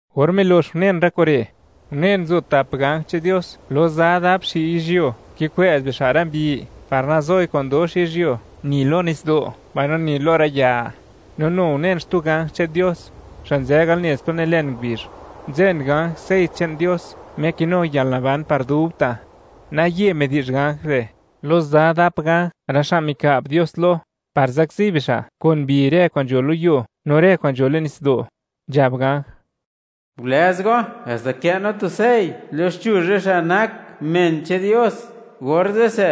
Or milox unen rë kure', unen, nzo tap ganj che'n Dios, lo za dap xi' yizhyuo, kikwë'z bixa' rë mbi par nazoi kwa'n dox yizhyuo, ni lo nitsdo', mbaino ni lo rë ya; no nu unen, xtu ganj che'n Dios, xa' nzë al nez plo nilen ngubizh, nzen ganj sey che'n Dios Me kinu yalnaban par dubta'; naye midi'zh ganj re' lo za dap ganj, rë xa' mika'b Dios lo, par zakzi bixa' kun mbi rë kwa'n nzho lo yuo no rë kwa'n nzho le'n nitsdo', nzhab ganj: ―Gulëz go haxta kë' no tu sey loxchuzh rë xa' nak men che'n Dios; orze'se,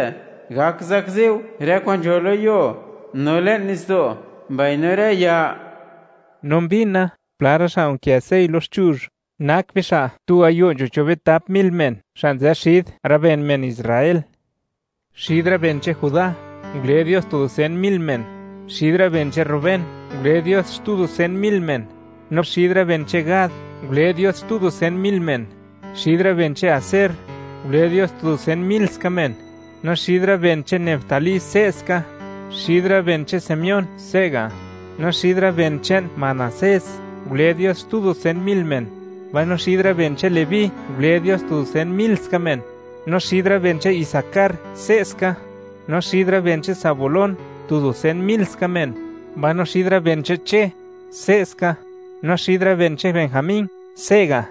gak zakzi go rë kwa'n nzho lo yuo, no le'n nitsdo', mbaino rë ya. No mbina, pla rë xa' nkë sey loxchuzh, nak bixa' tu gayo' nzho cho' bitap mil men, xa' nzë xid rë ben men Israel. Xid rë ben che'n Judá, ngule Dios tu dusen mil men; xid rë ben che'n Rubén ngule Dios xtu dusen mil men; no xid rë ben che'n Gad ngule Dios xtu dusen mil men; xid rë ben che'n Aser ngule Dios tu dusen mil ska men; no xid rë ben che'n Neftalí se'ska; xid rë ben che'n Simeón se'ga'; no xid rë ben che'n Manasés ngule Dios xtu tu dusen mil men; mbaino xid rë ben che'n Leví ngule Dios tu dusen mil ska men; no xid rë ben che'n Isacar se'ska; no xid rë ben che'n Zabulón tu dusen mil ska men; no xid rë ben che'n Che se'ska; mbaino xid rë ben che'n Benjamín se'ga'.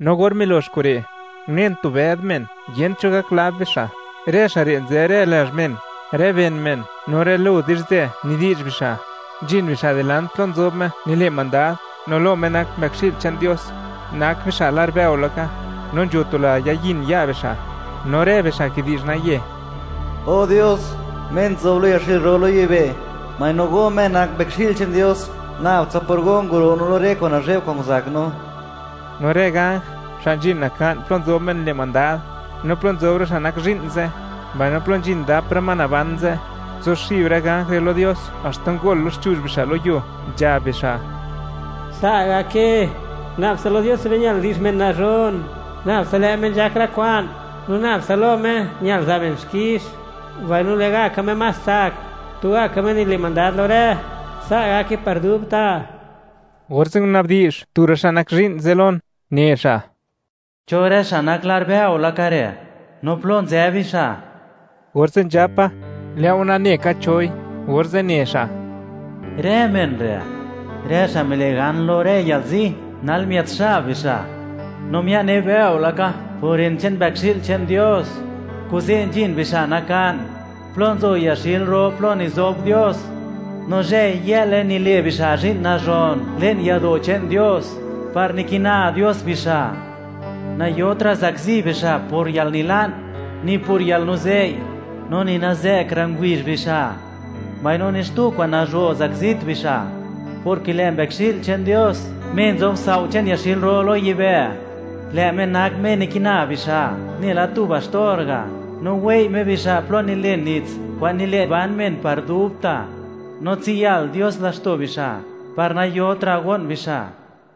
No or milox kure', unen tu bëd men, yent cho gak lab bixa', rë xa' re' nzë rë lazh men, rë ben men no rë lo di'zhzë nidi'zh bixa'. Nzhin bixa' dilant plo nzob Me nile' mandad no lo Me nak Mbëkxi'l che'n Dios, nak bixa' lar bëo laka, no nzho tu la yayin ya' bixa', no rë bixa' kidi'zh naye: O Dios, Me nzob lo yaxil ro lo yibë', mbaino Go Me nak Mbëkxi'l che'n Dios. Nabtsa por Go nguro' no lo rë kwa'n nazhe'b kwa'n nguzak no. No rë ganj xa' nzhin naka'n plo nzob Me nile' mandad, no plo nzob rë xa' nak zhi'n ze', mbaino plo nzhin dap rë ma naban ze'; nguzuxib rë ganj re' lo Dios, haxta ngol loxchuzh bixa' lo yuo, nzhab bixa': Sa' gake; nab tsa lo Dios che'n be ñal di'zh men nazhon; nabtsa lë' Me nzhak rë kwa'n, no nab tsa lo Me ñal za' men xkix, mbaino lë'gaka Me más tsak. Tugaka lë' Me nile' mandad lo rë. Sa' gake, par dubta'. Orze' nguna'bdi'zh tu rë xa' nak zhi'n ze' lon, ne xa': ―¿Cho rë xa' nak lar bëo laka re', no plo nzë bixa'? Orze' nzhapa: ―Lë'o nane ka choi. Orze' ne xa': ―Rë men re', rë xa' mile' gan lo rë yalzi, nal miët xab bixa', no mia'ne bëo laka por ren che'n Mbëkxi'l che'n Dios. Kuze', nzhin bixa' naka'n plo nzo yaxil ro plo nizob Dios; no zhëy-yë'le nile' bixa' zhi'n nazhon le'n yado' che'n Dios, par nikina Dios bixa'. Nayotra' zakzi bixa' por yalnila'n, ni por yalnuzei', no ni nazë'kra' ngubizh bixa', mbaino ni xtu kwa'n nazho' zakzit bixa', porke lë' Mbëkxi'l che'n Dios Me nzob sao' che'n yaxil ro lo yibë', lë' Me nak Me nikina bixa', nela tu baxtor ga', no wei' Me bixa' plo nilën nits kwa'n nile' ban men par dubta', no tsiyal Dios laxto' bixa' par nayotra' go'n bixa'.